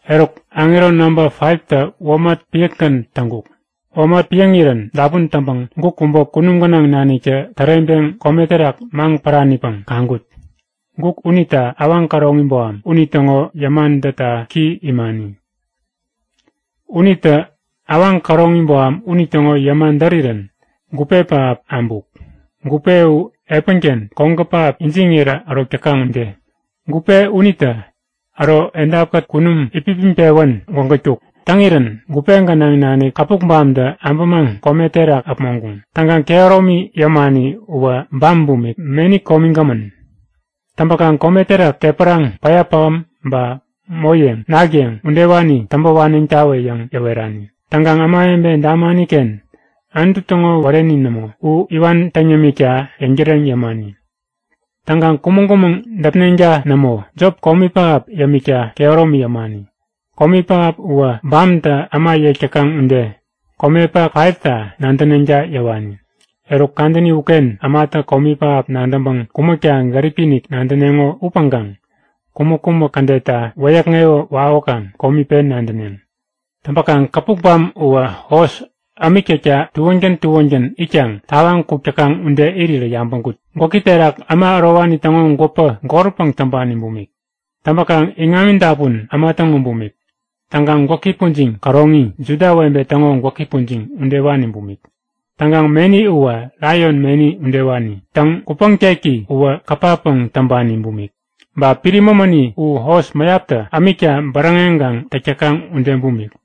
Eruk aŋero namba 5tä womat piäkgän täŋkuk. Womat piäŋirän dapun täŋpäŋ guk kubä kunum gänaŋ naniktä täreŋpeŋ kome terak maŋ päranipäŋ kaŋkut. Guk unita awaŋ käroŋi boham, unitäŋo yäma dätta ki imani. Unitä awaŋ käroŋi boham unitäŋo yäma därirän gupe pähap abuk. Gupe u epänken kogä pähap ijiŋirä ärok täkaŋ ude. Gupe unitä äro edapkät kunum itpipiŋpewän gwägätkuk. Täŋirän gupe gänaŋ nanik käpukbamtä abämaŋ kome terak äpmoŋkuŋ. Täŋkaŋ kehäromi yämani uwä bam bumik, meni komigämän. Täŋpäkaŋ kome terak tepäraŋ, päya pähäm ba moyeŋ, nak yeŋ udewani täŋpä waneŋtawä yäŋ yäwerani. Täŋkaŋ ämawebe damani-ken Anutu täŋo wäreni nämo, u iwan täŋ yämikta yäŋtäreŋ yämani. Täŋkaŋ kumäŋ-kumäŋ däpneŋta nämo. Jop, komi pähap yämikta kehäromi yämani. Komi pähap uwä bamtä äma yek täkaŋ ude komepak 5ta nadäneŋta yäwani. Eruk kadäni uken ämatä komi pähap nadäŋpäŋ kumäkta gäripi-inik nadäneŋo upäŋkaŋ kumäk-kumäk kädetta wäyäkŋewä wawäkaŋ komi pen nadäneŋ. Täŋpäkaŋ käpukbam uwä hos ämik täkta tuängän tuängän itkaŋ tawaŋ kuk täkaŋ ude irirä yabäŋkut. Gwäki terak äma ärowani täŋo gwäpä golpäŋ täŋpani bumik. Täŋpäkaŋ iŋami dapun äma täŋo bumik. Täŋkaŋ gwäki pujiŋ käroŋi, Juda webe täŋo gwäki pujiŋ udewani bumik. Täŋkaŋ meni uwä, laion meni udewani. Täŋ, kupäŋteki uwä kapapäŋ täŋpani bumik. Ba piri mämäni u hos mäyaptä ämikta bäräŋeŋkaŋ täk täkaŋ ude bumik.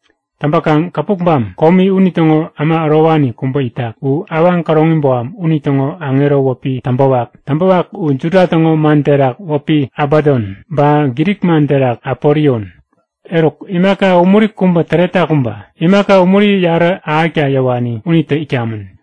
Täŋpäkaŋ käpukbam komi unitäŋo äma ärowani kubä itak. U awaŋ käroŋi boham unitäŋo aŋero wäpi Täŋpäwak. Täŋpäwak u Juda täŋo man terak wäpi Abadon, ba Grik man terak Apolion. Eruk imaka umuri kubä täretak uba. Imaka umuri yarä ahäkta yäwani unitä itkamän.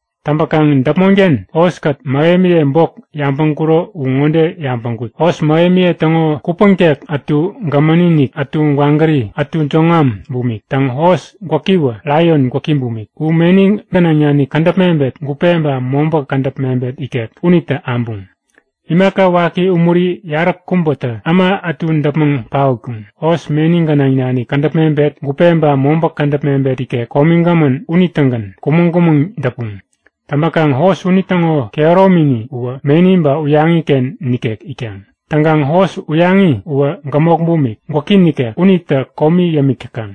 Täŋpäkaŋ däpmonken hoskät, mähemiye bok yabäŋkuro u ŋode yabäŋkut; Hos mähemiye täŋo kupäŋtek ätu gämäni-inik, ätu gwagäri, ätu jäŋwam bumik. Täŋ, hos gwäkiwä laion gwäki bumik. U meni gänaŋ nanik kädäp mebet, gupe ba mobä kädäp mebet ikek unitä abuŋ. Imaka waki umuri yaräkubätä äma ätu däpmäŋ paotkuŋ. Hos meni gänaŋ nanik kädäp mebet, gupe ba mobä kädäp mebet ikek komigämän unitägän kumäŋ-kumäŋ däpuŋ. Täŋpäkaŋ hos unitäŋo kehäromini uwä meni ba uyaŋi-ken nikek itkaŋ. Täŋkaŋ hos uyaŋi uwä gämok bumik, gwäki nikek. Unitä komi yämik täkaŋ.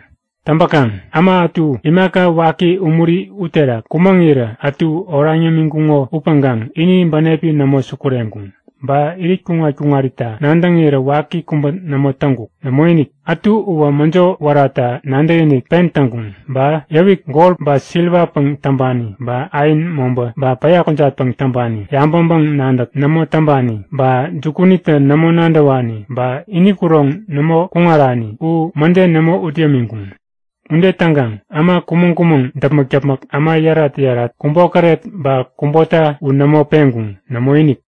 Täŋpäkaŋ äma ätu imaka waki umuri uterak kumäŋirä ätu oraŋ yämiŋkuŋo upäŋkaŋ ini bänepi nämo sukureŋkuŋ. Ba irit kuŋat-kuŋarita nadäŋirä waki kubä nämo täŋkuk. Nämoinik! Ätu uwä mäjo wärata nadäkinik pen täŋkuŋ. Ba yäwik gol ba siriwapäŋ täŋpani ba ain, mobä ba päya kujatpäŋ täŋpani, yabäŋpäŋ-nadäk nämo täŋpani ba jukunitä nämo nadäwani ba ini kuroŋ nämo kuŋarani u mäde nämo ut yämiŋkuŋ. Ude täŋkaŋ äma kumäŋ-kumäŋ däpmäk-däpmäk, äma yärat-yärat, kubokäret, ba kubota u nämo peŋkuŋ. Nämoinik!